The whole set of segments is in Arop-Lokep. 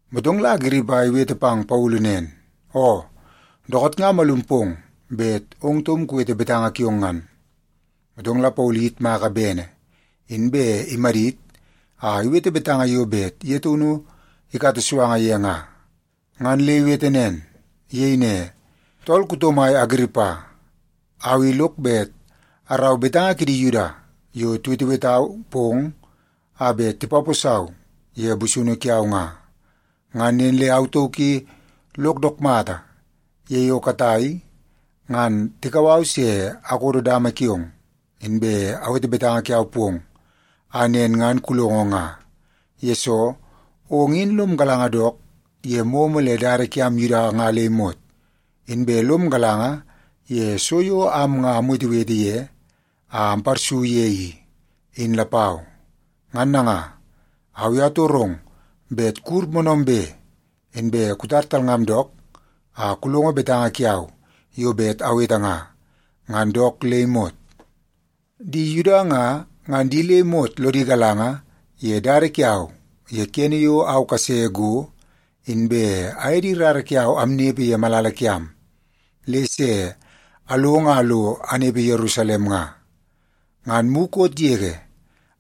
Motong la Agiripa iwete pang Paulu nen, “Oo, dookoot nga amalum pong bet ong taum kuwete betanga kiong ngan.” Motong la Paulu iyitmaka bene, inbe imadit a iwete betanga yo bet ye taunu ikata suanga ye nga, ngan le iwete nen. Iyei ne, “Tool kuto mai Agiripa, au i lok bet arau betanga kidi Yuda yo tiwetewetau pong a bet tipaposau ye busunu kiau nga. Ngan nen le au tauk i lok dook mata ye yo katai ngan tikau au se akodo dama kiong, inbe awete betanga kiau pong a nen ngan kulongo nga, yesoo ong in lom galanga dook ye momo le dada kiam Yuda nga le imot. Inbe lom galanga ye so yo am nga amwetewete ye a amparsu ye i, in lapau. Ngan nanga, au i atorong bet kuwur moonoombe, inbe kutar talngam dook a kulongo betanga kiau yo bet awete nga, ngan dook le imot. “Di Yuda nga, ngan di le imot lodi galanga ye dada kiau ye kene yo au kase go inbe aye di rara kiau amnepe ye malala kiam, le se along a lo anepe Yerusalem nga. Ngan mukot yege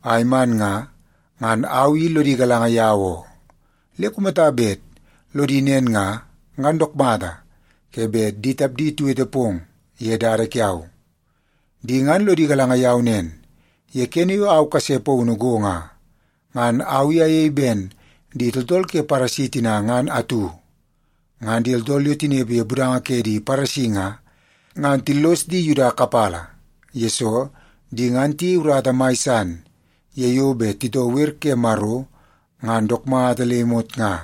a iman nga, ngan au i lodi galanga yau oo. Le kumata bet lodi nen nga, ngan dook mata ke bet di tapdi tiwete pong ye dada kiau. Di ngan lodi galanga yau nen, ye kene yo au kase paunu go nga, ngan au i ayei ben di tooltool ke Paresi tina ngan atu. Ngan di tooltool yo tinepe ye budanga ke di Paresi nga, ngan tillos di Yuda kapala, yesoo di ngan tiyei urata mai san ye yo bet titoo wer ke Maro ngan dook mata le imot nga.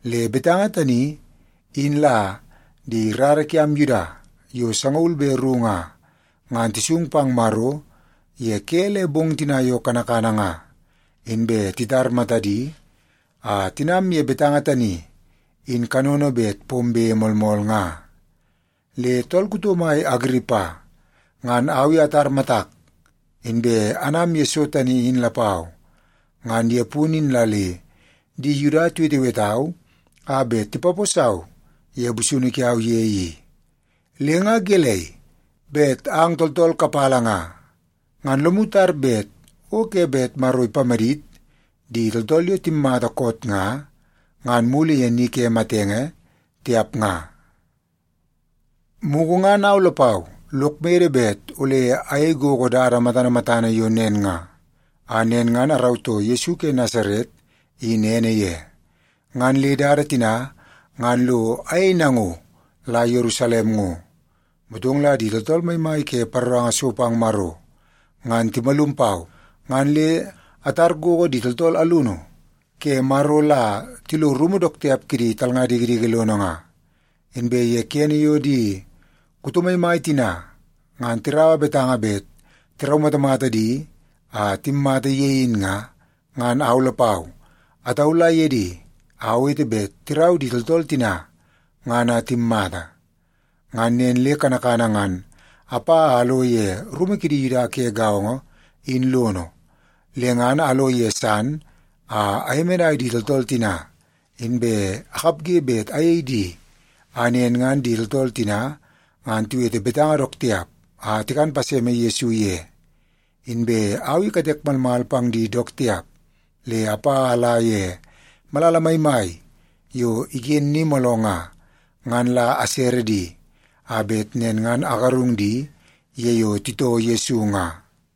Le betanga tani in la di rara kiam Yuda yo sangaul be ru nga, ngan tisung pang Maro ye ke le bong tina yo kanakana nga, inbe titar matadi a tinam ye betanga tani in kanono bet pombe moolmool nga. Le tool kuto mai Agiripa, ngan au i atar matak, inbe anam ye so tani in lapau. Ngan ye punu in la le di Yuda tiwetewetau a bet tipaposau ye busunu kiau ye i. Le nga gelei, bet ang tooltool kapala nga, ngan lomu tar bet o ke bet Maro ipamadit di tooltool yo timmata koot nga, ngan mulu ye ni ke matenge, tiap nga? “Mugu ngan au lapau lok mede bet ole ayei gogo dada matana matana yo nen nga, a nen ngan arautoo Yesu ke Nasaret in ene ye. Ngan le dada tina ngan lo ayei nango la Yerusalem ngo. Motong la di tooltool maimai ke paroranga so pang Maro ngan timalum pau, ngan le atar gogo di tooltool alunu ke Maro la tilo rumu dook tiap kidi talnga dikidiki lono nga. Inbe ye kene yo di kuto maimai tina ngan tiraua betanga bet tiraumatamata di a timmata ye in nga, ngan au lapau ataula ye di a awete bet tirau di tooltool tina ngan a timmata. Ngan nen le kanakana ngan apa a alo ye rumu kidi Yuda ke gaongo in lono, le ngan alo ye san a ayemenai di tooltool tina, inbe akapge bet ayei di a nen ngan di tooltool tina ngan tiwete betanga dook tiap a tikan paseme Yesu ye. Inbe au i katek malmal pang di dook tiap, le apa a ala ye malala maimai yo iken ni mooloo nga, ngan la asere di a bet nen ngan agarung di ye yo titoo Yesu nga.”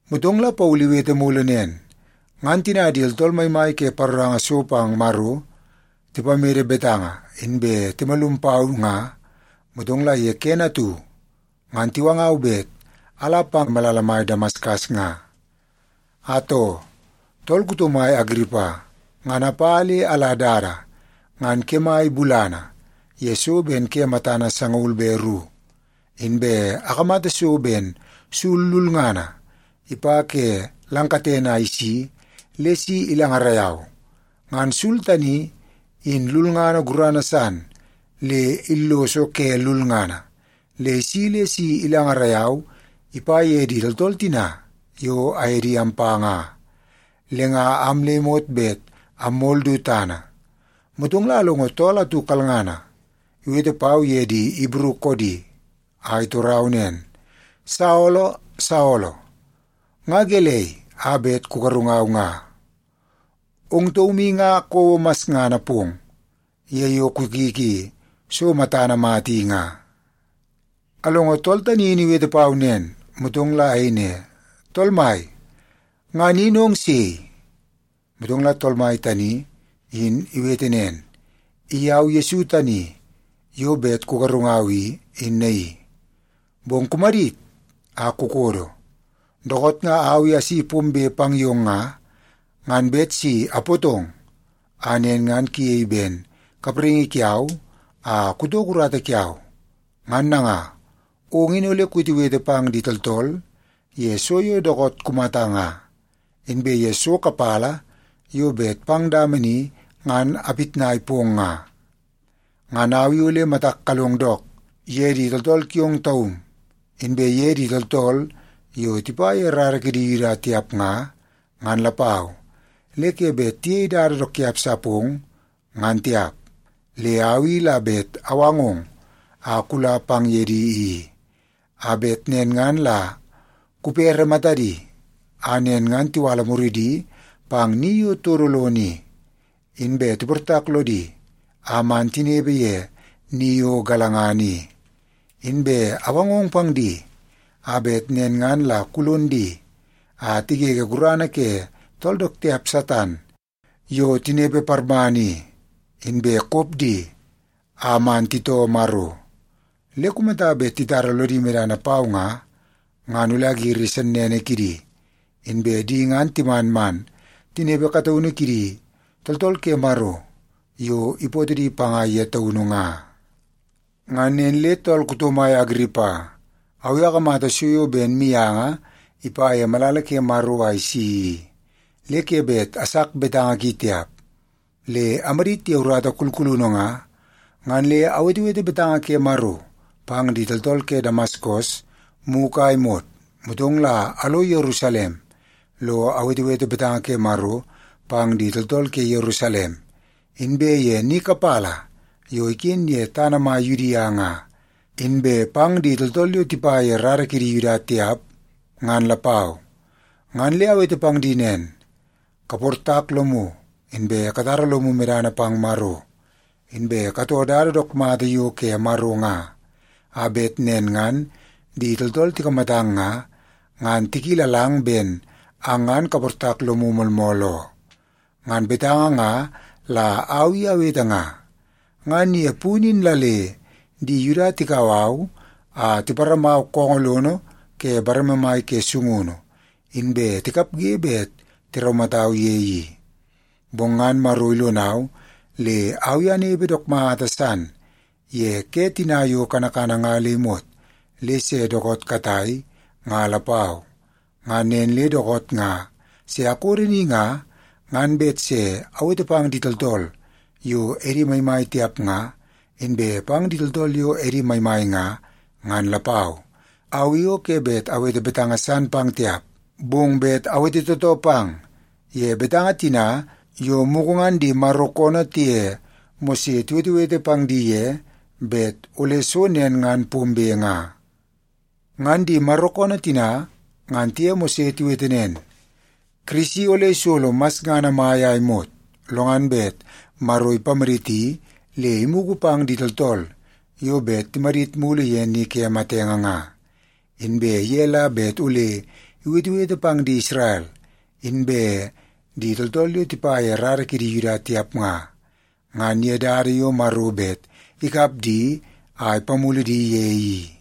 Motong la Paulu iwete mulu nen, “Ngan tina di tooltool maimai ke paroranga so pang Maro tipamede betanga inbe timalum pau nga, motong la kene atu ngan tiwangau bet ala pang malala mai Damaskas nga. Atoo, tool kuto mai Agiripa, ngan apa le ala dada ngan kemai bulana ye so ben ke matana sangaul be ru, inbe akamata so ben sul lulngana ipa ke lang katene a isi le si ilangarai au. Ngan sul tani, in lulngana gurana san le illoso ke lulngana, le isi le si ilangarai au ipa ye di tooltool tina yo aye di ampa nga. Le nga am le imot bet ammol du tana. Motong la alongo tool atu kalngana iwete pau ye di Ibru koodi, a itorau nen, ‘Saolo, Saolo, nga gelei a bet kugarungau nga? Ong taum i nga kouo masngana pong ye yo kukiki so matana mata i nga.’ “Alongo tool tani in iwete pau nen, motong la ayei ne, ‘Tool Mai, ngan in ong sei?’ “Motong la Tool Mai tani in iwete nen, ‘I au Yesu tani yo bet kugarungau i, in naii. Bong kumadit a kukodo. Dookoot nga au i asi pombe pang yong nga, ngan bet si apootong a nen ngan kuyei ben kapraingi kiau a kutoko urata kiau. Ngan nanga, ong in ole kuwetewete pang di tooltool ye so yo dookoot kumata nga, inbe ye so kapala yo bet pang dama ni ngan apitnai pong nga. Ngan au i ole matak kalong dook ye di tooltool kiong taum, inbe ye di tooltool yo tipa ye rara kidi Yuda tiap nga, ngan lapau, le ke bet tiyei dada dook tiap sa pong, ngan tiap. Le au i la bet awangong a kula pang ye di i, a bet nen ngan la kupere matadi, a nen ngan tiwala muridi pang ni yo todo lono i, inbe tiportak lodi a man tinepe ye ni yo galangana i. Inbe awangong pang di a bet nen ngan la kulon di a tigege gurana ke tool dook tiap Satan yo tinepe parmana i, inbe kop di a man titoo Maro. Le kumata bet titara lodi medana pau nga, ngan ole agiri sennene kidi, inbe di ngan timan man tinepe kataunu kidi tooltool ke Maro yo ipootoo di panga ye taunu nga.’ “Ngan nen le tool kuto mai Agiripa, au i akamata so yo ben mianga ipa ye malala ke Maro a isi i, le ke bet asak betanga ki tiap. Le amadit ye urata kulkulunu nga, ngan le awetewete betanga ke Maro pang di tooltool ke Damaskas mugu a imot, motong la alo Yerusalem lo awetewete betanga ke Maro pang di tooltool ke Yerusalem, inbe ye ni kapala yo iken ye tana mai Yudia nga, inbe pang di tooltool yo tipa ye rara kidi Yuda tiap, ngan lapau. Ngan le awete pang di nen, ‘Kaportak lomu, inbe katara lomu medana pang Maro. Inbe katoo dada dook mata yo ke Maro nga, a bet nen ngan di tooltool tikamatang nga, ngan tikilalang ben ang ngan kaportak lomu moolmool oo.’ Ngan betanga nga la au i awete nga. Ngan ye punu in la le di Yuda tikau au a tiparamau koongoo lono ke bareme mai ke sungunu, inbe tikapge bet tiraumatau ye i. Bong ngan Maro ilonau le au i anepe dook mata san ye ke tina yo kanakana nga le imot le se dookoot katai nga lapau. Ngan nen le dookoot nga se akodo ni nga, ngan bet se awete pang di tooltool yo edi maimai tiap nga, inbe pang di tooltool yo edi maimai nga, ngan lapau. Au i o ke bet awete betanga san pang tiap, bong bet awete tootoo pang ye betanga tina yo mugu ngan di Maro koonoo tiye Mose tiwetewete pang di ye bet ole so nen ngan pombe nga. Ngan di Maro koonoo tina ngan tiye Mose tiwete nen, ‘Kirisi ole isolo masngana mai a imot, lo ngan bet Maro ipamaditi le imugu pang di tooltool yo bet timadit mulu ye ni ke matenge nga. Inbe ye la bet ole iwetewete pang di Isrel, inbe di tooltool yo tipa ye rara kidi Yuda tiap nga, ngan ye dada yo Maro bet ikap di a ipamulu di ye i.’”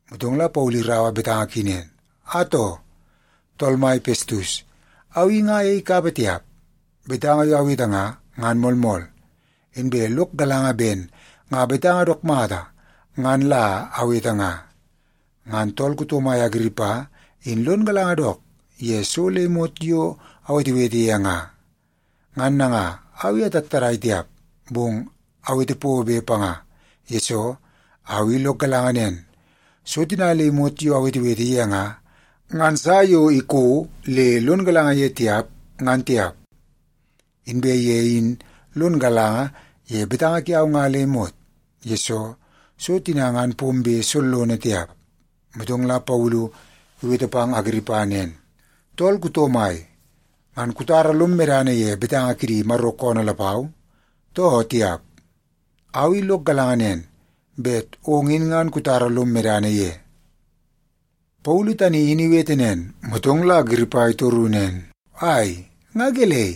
Motong la Paulu iraua betanga ki nen, “Atoo, tool mai Pestus, au i nga ayei kapa tiap. Betanga yo awete nga, ngan moolmool, inbe lok galanga ben nga betanga dook mata ngan la awete nga. Ngan tool kuto mai Agiripa in lon galanga dook ye so le imot yo awetewete ye nga. Ngan nanga, au i atattadai tiap, bong awete pobe panga, yesoo au i lok galanga nen, so tina le imot yo awetewete ye nga, ngan sa yo iko le lon galanga ye tiap, ngan tiap. Inbe ye in lon galanga ye betanga kiau nga le imot, yesoo so tina ngan pombe sollono tiap.” Motong la Paulu iwete pang Agiripa nen, “Tool kuto mai, ngan kutara lom medana ye betanga kidi Maro koonoo lapau, too tiap? Au i lok galanga nen, bet ong in ngan kutara lom medana ye.” Paulu tani in iwete nen, motong la Agiripa itoru nen, “Ai, nga gelei?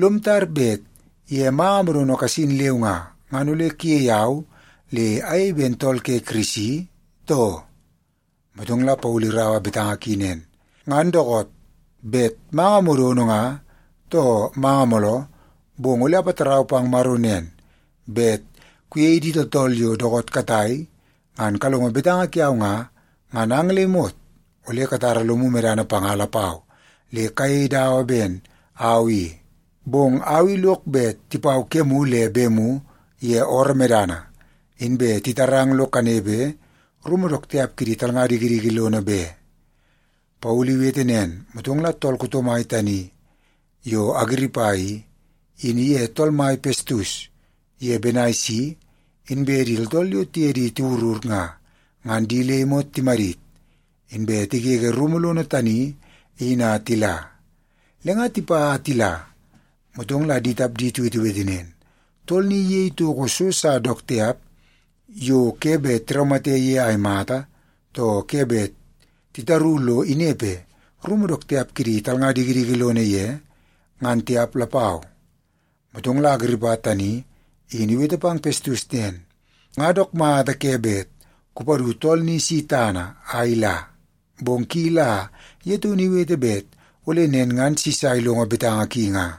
Lom tar bet ye manga modono kasin leu nga, ngan ole kuyei au le ayei ben tool ke Kirisi, too?” Motong la Paulu iraua betanga ki nen, “Ngan dookoot, bet manga modono nga too manga mooloo, bong ole apatarau pang Maro nen, bet kuye di tooltool yo dookoot katai ngan kalongo betanga kiau nga, ngan ang le imot ole katara lomu medana panga lapau le kayei dawa ben au i. Bong au i lok bet tipau kemu le bemu ye ooroo medana, inbe titarang lo kanepe rumu dook tiap kidi talnga dikidiki lono be.” Paulu iwete nen, motong la tool kuto mai tani yo Agiripa i, in iye tool mai Pestus ye Benaisi, inbe di tooltool yo tiye di tiwurur nga, ngan di le imot timadit, inbe tigege rumu lono tani in a tila. Le nga tipa a tila, motong la di tapdi tiwetewete nen, “Tool ni iyei toko so sa dook tiap yo ke bet tiraumate ye a imata, too ke bet titaru lo inepe rumu dook tiap kidi talnga dikidiki lono ye, ngan tiap lapau.” Motong la Agiripa tani in iwete pang Pestus nen, “Nga dook mata ke bet kupadu tool ni si tana a ila, bong ki la ye taunu iwete bet ole nen ngan Sisa ilongo betanga ki nga.”